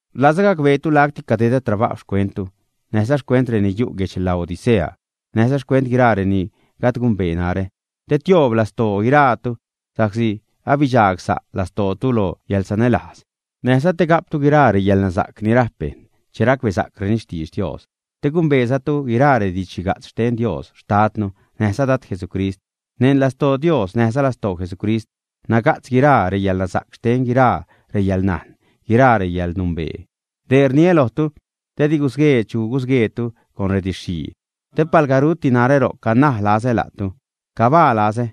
Rlazä gacbeetu lacti cadedä trabajw xcuentu, näjza xcuent reni yu' guedx Laodicea, näjza xcuent guiraa reni gajd gumbee narä. Te tioob lastoo guiraatu sa'csi abidxagsa' lastootu lo yäḻsanälajz, näjza te ga'ptu guiraa reyäḻnasa'c ni rajp bejṉ che racbesa'creni xtidx Dios. Te gumbeezatu guiraa redidx-xhiga'tz xten Dios xtadnu näjza Dad Jesucrist. Neṉ lastoo Dios näjza lastoo Jesucrist naga'tz guiraa reyäḻnasa'c xten guiraa reyäḻnajn, guiraa yäḻnumbee. Dee rniä lojtu te di gusguee chu gusgueetu con rediidx-xhii. Te palga ruti narä ro'c, canaj lazä la'tu, cabaa lazä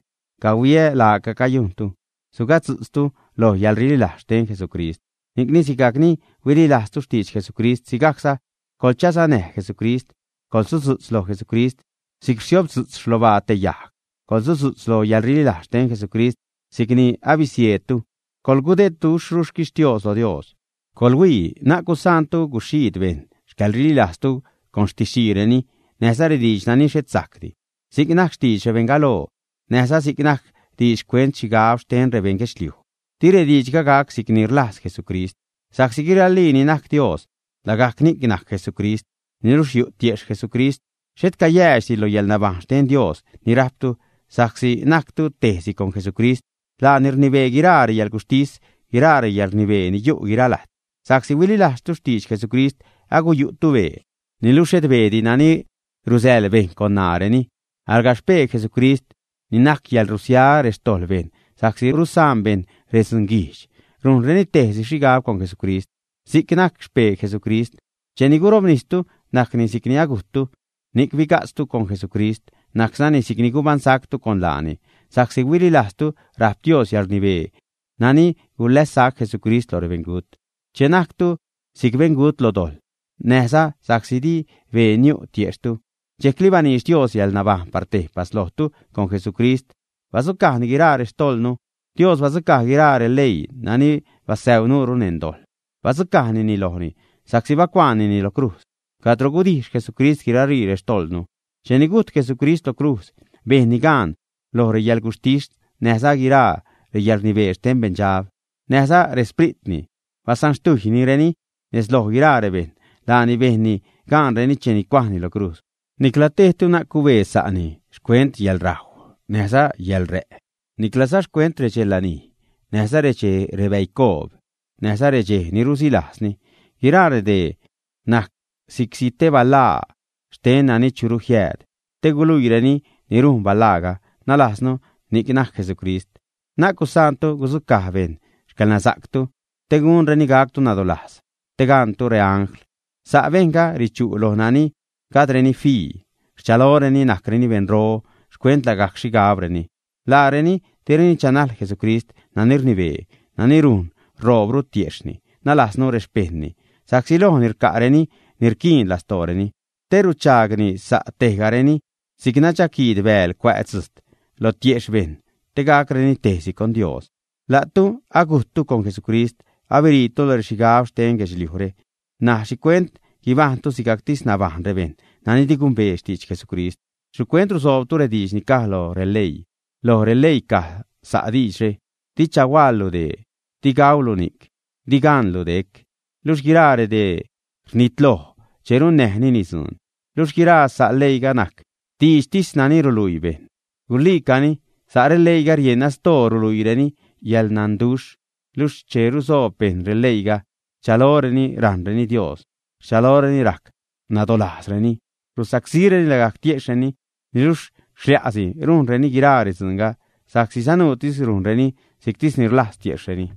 cahuiä laaca cayujntu, sugatzu'tztu loj yäḻrililajz xten Jesucrist. Ni'cni sigajc ni huililajztu xtidx Jesucrist, sigajcza coḻchasanäj Jesucrist. Coḻsudzu'tz lo Jesucrist si'c rsiobdzu'tz xlobaa te yajg. Coḻsudzu'tz lo yäḻrililajz xten Jesucrist si'c ni abisieedtu. Coḻgudedduxhru xquixtios lo Dios. Coḻhuii, na'c gusaantu guxhiid bejṉ xcäḻrililajztu con xtiidxtisreni näjza rediidx nani xhet sajcdi, si'c najc xtidx rebeṉ galoo, näjza si'c najc diidx xcuent xhigab xten rebeṉ guedxliuj, di rediidxga gac si'cni rlajz Jesucrist. Sa'csi guiralii ni najc Dios, lagajc ni'c najc Jesucrist, niluxh yu' tiejxh Jesucrist. Xhet cayäädxdi lo yäḻnabajṉ xten Dios ni rajptu sa'csi najctu tejsi con Jesucrist. Laani rnibee guiraa reyäḻguxhtis, guiraa reyäḻrnibee ni yu' guira lajt. Sa'csi huililajztu Jesucrist aguyu'tu bee, niluxh xhet beedi nani rusäḻ bejṉ con ṉaareni, alga xpee Jesucrist, ni najc yäḻrusia xtojḻ bejṉ sa'csi rusaan bejṉ redzunguijdx, rujnreni tejsi xhigab con Jesucrist. Si'c najc xpee Jesucrist. Cheni gurobnistu najcni si'cni agujttu ni'c biga'tztu con Jesucrist, najczani si'cni gubaṉsactu con laani sa'csi huililajztu rajp Dios yäḻrnibee nani gulässac Jesucrist lo rebeṉgut. Che najctu si'c beṉgut lo dojḻ, näjza sa'csi di bee niu' tiejxhtu, dxejcli baniidx Dios yäḻnabajṉ par tejpas lojtu con Jesucrist, badzucajni guiraa rextojḻnu. Dios badzucaj guiraa releii nani basäuu nuure neṉ dojḻ, badzucajnini lojni, sa'csi bacuaanini lo crujz, cadro gudijx Jesucrist guiralii rextojḻnu. Cheni gujt Jesucrist lo crujz bejnni gaan loj reyäḻguxhtis näjza guiraa reyäḻrnibee xten beṉdxab näjza rexspritni. Basanxtujynireni nez loj guiraa rebejṉ. Laani bejnni gaanreni cheni cuajni lo crujz. Nicla tejtu na'c cubee sa'ni xcuent reyäḻrajw näjza reyäḻrä', niclaza xcuent redxe lanij näjza rexchej rebäicoob, näjza redxej ni rusilajzni. Guiraa redee najc si'csi te balaa xten nani churu jiääd, te guluiireni ni rujn balaaga, nalajznu ni'c najc Jesucrist. Na'c gusaantu gudzucaj bejṉ xcäḻnasa'ctu te gunreni gactu nadolajz, te gaṉtu reangl. Sa' bejṉga richu' loj nani gajdreni fii; rchaloreni najcreni beṉro xcuent lagajc xhigabreni. Laareni direni chanajl Jesucrist nani rnibee, nani rujn ṟoobru tiejxhni, nalajznu rexpejṉni, sa'csi lojni rca'reni ni rquiin lastooreni, te ruchaagni sa' tejgareni si'c nadxaquiid bääl cuä' dzujt lo tiejxh bejṉ, te gacreni tejsi con Dios. La'tu agujttu con Jesucrist, abiriitu lo rexhigab xten guedxliujre. N̲aj ¿xhicuent guibajṉtu sigajctis nabajṉ rebejṉ nani di gumbee xtidx Jesucrist, ä? ¿Xhicuent rusoobtu rediidx ni caj lo releii? Loj releii caj sa' diidxre: “Di chahuaḻlu dee, di gaulu ni'c, di caṉlu dec.” Luxh guiraa redee rnitloj che runnäjnini dzuun. Luxh guiraa sa' leiiga najc diidxtis nani ruluii bejṉ. Guluiicani sa' releiiga rieṉ asdoo ruluiireni yäḻnanduxh, luxh che rusoob bejṉ releiiga rchaloreni rajṉreni Dios, rchaloreni rac nadolajzreni, rusacsíreni lagajc tiejxhreni. Niluxh xlai'si rujnreni guiraa redzuunga, sa'csi sanuutis rujnreni si'ctisni rlajz tiejxhreni.